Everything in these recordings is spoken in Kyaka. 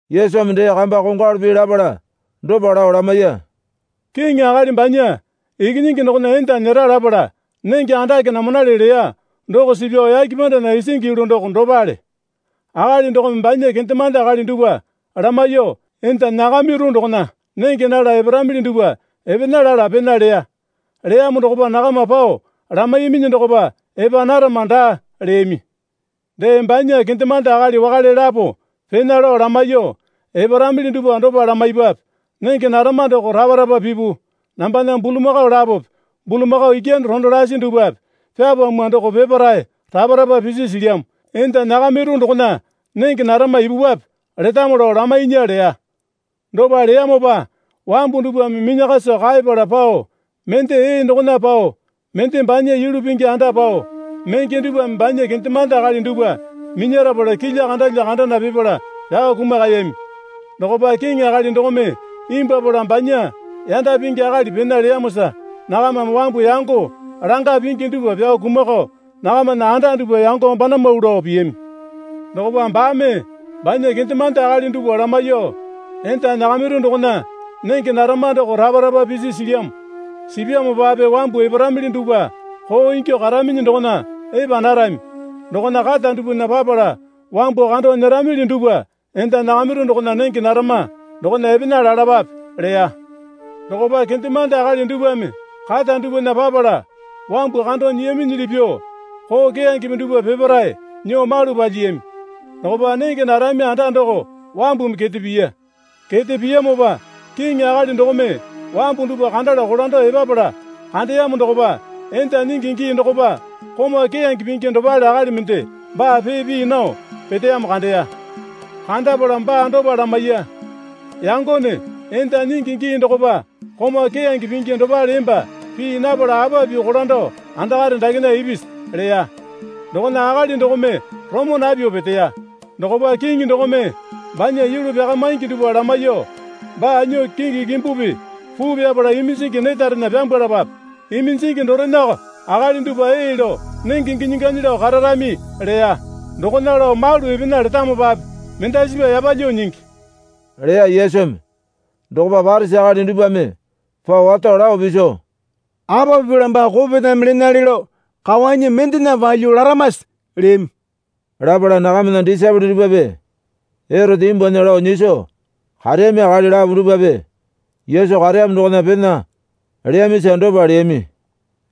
Yesumi dee kamba kongwalu pii lapala dopa lao lamaiya. Kiŋi akali banya ikinyingi dokona enda nyera lapala nenge andake namanale leya doko suu pyao yake pandana isingi yulu doko dopale. Akali dokome banya kendemande akali dupwa lamaiyuo, Enda nyakamiru dokona nenge nala eparamili dupwa epena lala pena leya. Leyamo dokopa nakama pao lamaiyaminyi dokopa, Epa narama daa, leyami. Dee banya kendemande akali wakale lapo pena lao lamaiyuo, Eparamili dupwa dopa lamaipwape, Nenge narama doko rapa rapa pipu. Nambana bulamakao lapope bulamakao ikyane rondo lasi dupwape pyapamwa doko peparae rapa rapa pisi silyamo. Enda nyakamiru dokona nenge narama ipupwape, letamo lao lamainya, leya. Dopa leyamopa wambu dupwame minyakaso kaepala pao, mende ee dokona pao mende banya yulu pingi anda pao menge dupwame banya kendemande akali dupwa minyarapala kilya kandalya kandana pipala pyao kumakayami. Dokopa kiŋi akali dokome imbwuapala banya yanda pingi akali pena leyamosa nakamame wambu yango longa pingi dupwa pyao kumakao nakamana anda dupwa yango banamau lao piyami. Dokopa baame banya kendemande akali dupwa lamaiyuo, Enda nyakamiru dokona nenge narama doko rapa rapa pisi silyamo. Sipyamopape wambu eparamili dupwa koo ingyuo karaminyi dokona epa narami. Dokona kata dupwana papala wambu kando nyeramili dupwa enda nyakamiru dokona nenge narama dokona epena lalapape, leya. Dokopa kendemande akali dupwame kata dupwana papala wambu kando nyiyaminyili pyuo koo keyangepe dupwa peparae nyuo malu palyiyami. Dokopa nenge narami anda doko wambumi kete piya. Kete piyamopa kiŋi akali dokome wambu dupwa kandala kolando epapala kandeyamo dokopa enda nyingi gii dokopa komau keyange pingi dopale akali mende baa pee pii nao peteyamo kandeya. Kandapala baa dopa lamaiya. Yangone enda nyingi gii dokopa komau keyange pingi dopale emba pii napala apa pyuo kolando andakare dakena ipisi? leya. Dokona akali dokome roma napyuo peteya. Dokopa kiŋi dokome banya yulu pyaka maingi dupwa lamaiyuo, Baa nyuo kingi kimbupi puu pyapapala iminjingi netarena pyambwalapape. Iminjingi dorenako akali dupwa ee lao nenge ginyi ganyi lao kararami, leya. Dokona lao malu epena letamopape mendasipa yapalyuo nyingi, leya Yesumi. Dokopa Parisi akali dupwame pao wato lao piso, Apa pipala baa kopetame lenale lao kawanyi mendena palyuo laramase? leyami. Lapala nakamana disaepole dupwape Erote nyimbunya lao nyiso kareyami akali lapo dupwape Yesu kareyamo dokona pena leyamisa dopa leyami.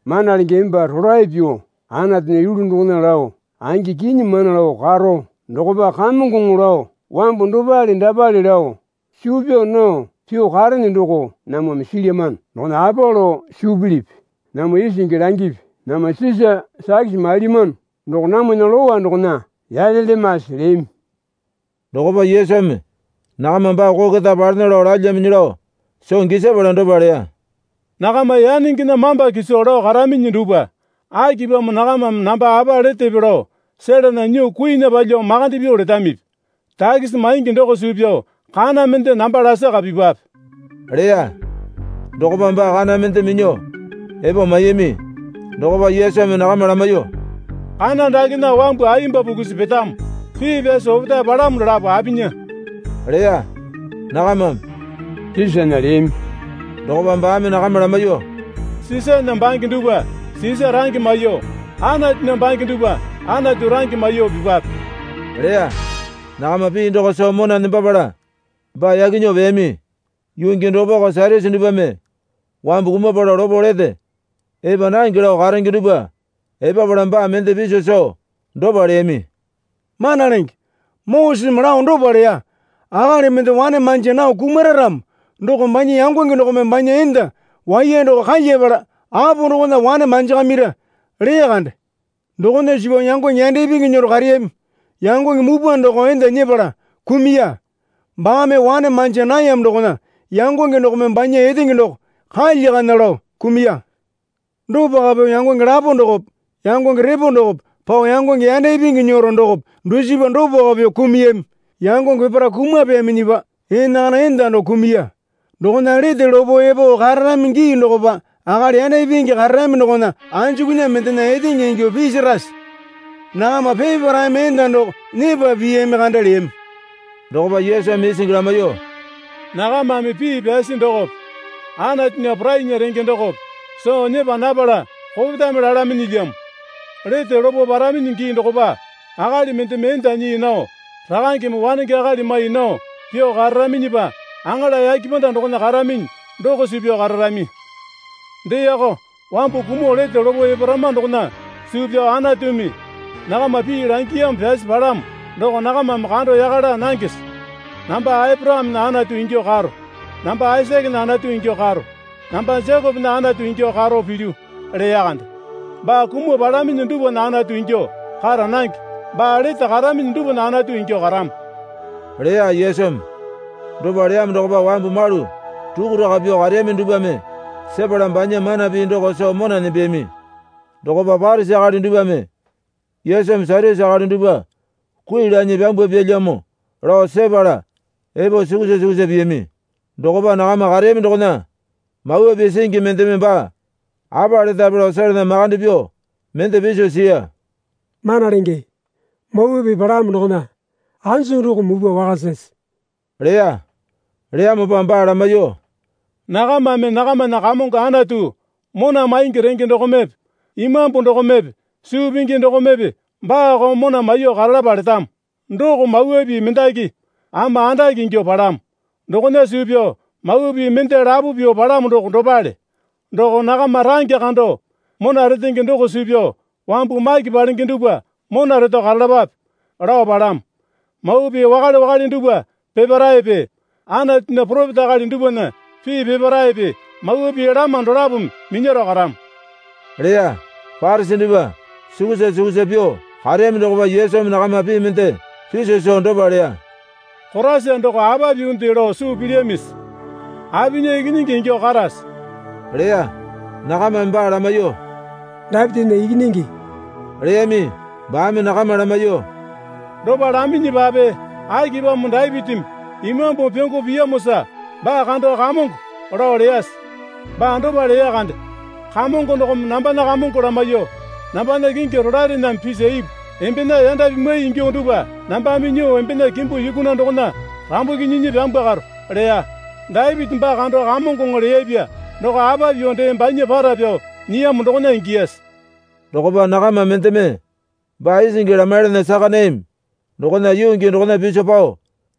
Mana Lenge, emba rolae pyuo Anatunya yulu dokona lao angi kinyi mana lao karo, dokopa Kamongoŋo lao wambu dopale dapale lao suu pyaa nao pyuo karene doko namwame silyamano. Dokona apa lao suu pilipi? namwa isingi langipi. Namwa Sisa takisi mailyamano doko namwana Lowa dokona yalelyamase? leyami. Dokopa Yesumi nakama baa koo keta palena lao lalyaminyi lao soo gisapala dopa leya. Nakama yanengena mamba kiso lao karaminyi dupwa, akipamo nakamame namba apa letepe lao selana nyuo kuinya palyuo makande pyuo letamipi? Takisi maingi doko suu pyao kana mende namba lasaka pipwape, leya. Dokopa baa kana mende minyuo epo maiyami. Dokopa Yesumi nakama lamaiyuo, Kana dakena wambu ayemba pukusi petamo pii yasi opetae palamo dolapo apinya? leya. Nakamame, Sisana, leyami. Dokopa baame nakama lamaiyuo, Sisana bange dupwa Sisa range maiyuo, Anatunya bange dupwa Anatu range maiyuo pipwape, leya. Nakama pii doko soo mona nembapala baa yaki nyuo peyami. Yuu gii dokopako Satyusi dupwame wambu kumapala lopo lete epa nange lao karenge dupwa epapala baa mende piso soo dopa leyami. Mana Lenge, Moseseme lao dopa leya. Akali mende wane manja nao kumara ramo doko banya yangonge dokome banya enda waiya doko kalyapala apo dokona wane manjakamira, leya kande. Dokona suu pyao yangonge yanda ipingi nyero kareyami. Yangonge mupwa doko enda nyepala kumuya. Baame wane manja nayamo dokona yangonge dokome banya etenge doko kalyakana lao kumuya. Dopako pyuo yangonge lapo dokope yangonge repo dokope pao yangonge yanda ipingi nyero dokope dusipa dopako pyuo kumuyami. Yangonge peparae kumapeyaminyipa enakana enda doko kumuya. Dokona lete lopo epo kararami gii dokopa akali yanda ipingi kararami dokona anjukunya mendena etenge ingyuo pisirase? Nakama peparaeme enda doko nyepa piyami kande, leyami. Dokopa Yesumi isingi lamaiyuo, Nakamame pii pyasi dokope Anatunya porainya renge dokope soo nyepa napala kopetame lalaminyilyamo. Lete lopo paraminyi gii dokopa akali mendeme enda nyii nao rakangeme wanenge akali mai nao pyuo kararaminyipa aŋala yake panda dokona karaminyi doko suu pyao kararami. Deeko, wambu kumuo lete lopo eparama dokona suu pyao Anatumi nakama pii langiyamo pyasi palamo doko nakamame kando yaka laa nangese? Namba Aporakamena Anatu ingyuo karo, namba Aisakena Anatu ingyuo karo, namba Jekopena Anatu ingyuo karo pilyu, leya kande. Baa kumuo palaminyi dupwana Anatu ingyuo kara nange baa lete karaminyi dupwana Anatu ingyuo karamo, leya Yesumi. Dopa leyamo dokopa wambu malu rukuraka pyuo kareyami dupwame sepala banya mana pii doko soo mona nembeyami. Dokopa Parisi akali dupwame Yesumi Satyusi akali dupwa kui lanyi pyambwapyalyamo lao sepala epo sukusa sukusa piyami. Dokopa nakama kareyami dokona Mawa Pii singi mendeme baa apa letape lao selana makande pyuo mende piso siya. Mana Lenge, Mawa Pii palamo dokona anjuku doko mupwa wakasase? leya. Leyamopa baa lamaiyuo, Nakamame nakamana Kamongo Anatu mona maingi renge dokomepe imambu dokomepe suu pingi dokomepe baako mona maiyuo karalapa letamo. Doko mawa pii mendaki ama andake ingyuo palamo. Dokona suu pyao mawa pii mende lapo pyuo palamo doko dopale. Doko, nakama range kando mona retenge doko suu pyao wambu maki palenge dupwa mona reto karalapape, lao palamo. Mawa Pii wakale wakale dupwa peparaepe Anatunya poropeta akali dupwana pii peparaepe mawa pii lama dolapome minyaro karamo, leya. Parisi dupwa sukusa sukusa pyuo kareyami dokopa Yesumi nakama pii mende piso soo dopa leya. Koraisa doko apa pyuonde lao suu pilyamisi? Apinya ikinyingi ingyuo karase? leya. Nakamame baa lamaiyuo, Dapitinya ikinyingi, leyami. Baame nakama lamaiyuo, Dopa laminyipape akipamo Dapitimi Imambumi pyongo piyamosa baa kando Kamongo, lao leyase? Baa dopa leya kande. Kamongo dokome nambana Kamongo lamaiyuo, Nambana kingi rolaerename pisa ipu. Embena yanda pimwai ingyuo dupwa nambame nyuo embena kimbu yukuna dokona rambuki nyinyi pyambwakaro. leya. Dapiti baa kando Kamongoŋo leyapya doko apa pyuo dee banya para pyao nyiyamo dokona ingiyase? Dokopa nakama mendeme baa isingi lamaiyalana saka nayami dokona yuu gii dokona piso pao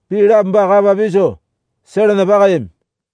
pii lapo baa kapa piso selana pakayami.